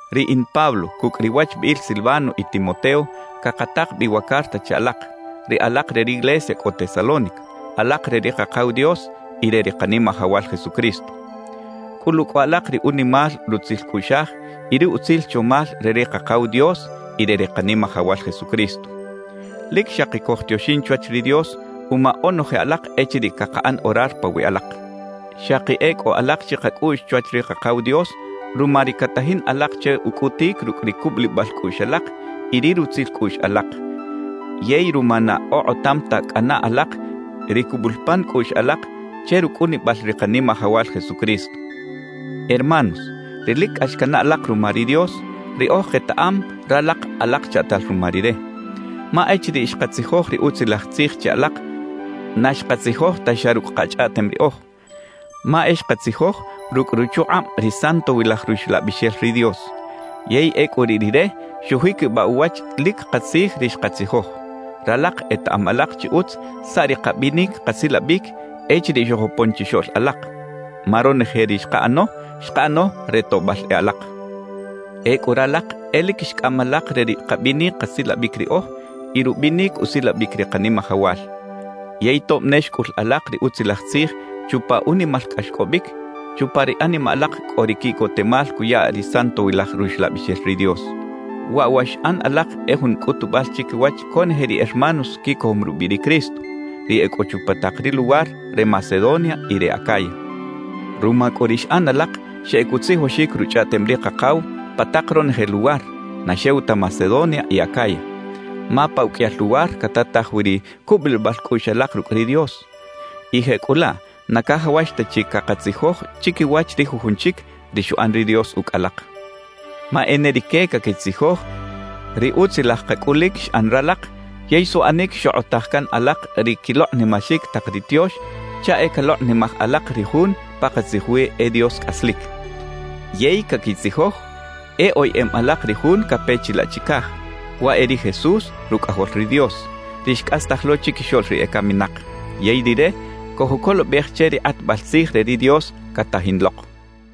Riꞌin Pablo cucꞌ ri wachbiꞌil Silvano y Timoteo cakatak bi wa carta che alak, ri alak re riglesia cꞌo Tesalónica, alak re ri Kakaw Dios y re ri Kanimajawal Jesucristo. Cꞌulu cꞌu alak ri unimal rutzil cꞌuꞌxaj y ri utzil chomal re ri Kakaw Dios y re ri Kanimajawal Jesucristo. Lic xaki cojtioxin chwach ri Dios uma onoje alak echiriꞌ cakaꞌan orar pawiꞌ alak. Xaki e cꞌo alak chikacꞌuꞌx chwach ri Kakaw Dios ruma ri catajin alak che ucꞌutic rucꞌ ri cubulibal cꞌuꞌx alak y ri rutzil cꞌuꞌx alak, yey ruma na okꞌotam ta cꞌana alak ri cubul pan cꞌuꞌx alak che rucꞌunibal ri Kanimajawal Jesucristo. Hermanos, ri lic cꞌax canaꞌ alak ruma ri Dios, riꞌoj ketaꞌam ralak alak chaꞌtal ruma Rire. Ma echiriꞌ xkatzijoj ri Utzilaj Tzij che alak, na xkatzijoj ta xa rucꞌ kachꞌaꞌtem riꞌoj, ma e xkatzijoj rucꞌ ruchukꞌab ri Santowilaj Ruxlabixel ri Dios; yey ecꞌu riꞌ Rire xujiquibaꞌ uwach lic katzij ri xkatzijoj. Ralak etaꞌam alak chi utz saꞌ ri kabinic kasilabic echiriꞌ xojopon chixoꞌl alak, ma ronoje ri xkaꞌano, xkaꞌano re toꞌbal e alak. Ecꞌu ralak e lic xcꞌam alak re ri kabinic kasilabic riꞌoj y rubinic usilabic ri Kanimajawal. Yey tob ne xcꞌul alak ri Utzilaj Tzij chupa unimal cꞌaxcꞌobic, chupa ri animaꞌ alak cꞌo ri quiꞌcotemal cuya ri Santowilaj Ruxlabixel ri Dios. Waꞌ wa xꞌan alak e jun cꞌutubal chiquiwach conoje ri hermanos quicojom rubiꞌ ri Cristo, ri e cꞌo chupa tak ri luwar re Macedonia y re Acaya. Ruma cꞌu ri xꞌan alak xeꞌec utzijoxic Ruchꞌaꞌtem ri Kakaw pa tak ronoje luwar, na xew ta Macedonia y Acaya. Ma pa uqꞌuiyal luwar catataj wi ri cubulibal cꞌuꞌx alak rucꞌ ri Dios, y jecꞌulaꞌ na cajawax ta chi cakatzijoj chiquiwach ri jujun chic ri xuꞌan ri Dios ucꞌ alak. Ma e ne rique caquitzijoj ri utzilaj kacꞌulic xꞌan ralak yey suꞌanic xokꞌotaj can alak ri quilokꞌnimaxic tak ri tiox chaꞌ e calokꞌnimaj alak ri Jun pakatzij wi e Dios cꞌaslic. Yey caquitzijoj e oyeꞌem alak ri Jun cape chilaꞌ chicaj, waꞌ e ri Jesús Rucꞌajol ri Dios, ri xcꞌastaj lo chiquixoꞌl ri ecaminak. Yey Rire cojucolobej che ri kꞌatbal tzij re ri Dios catajin lok.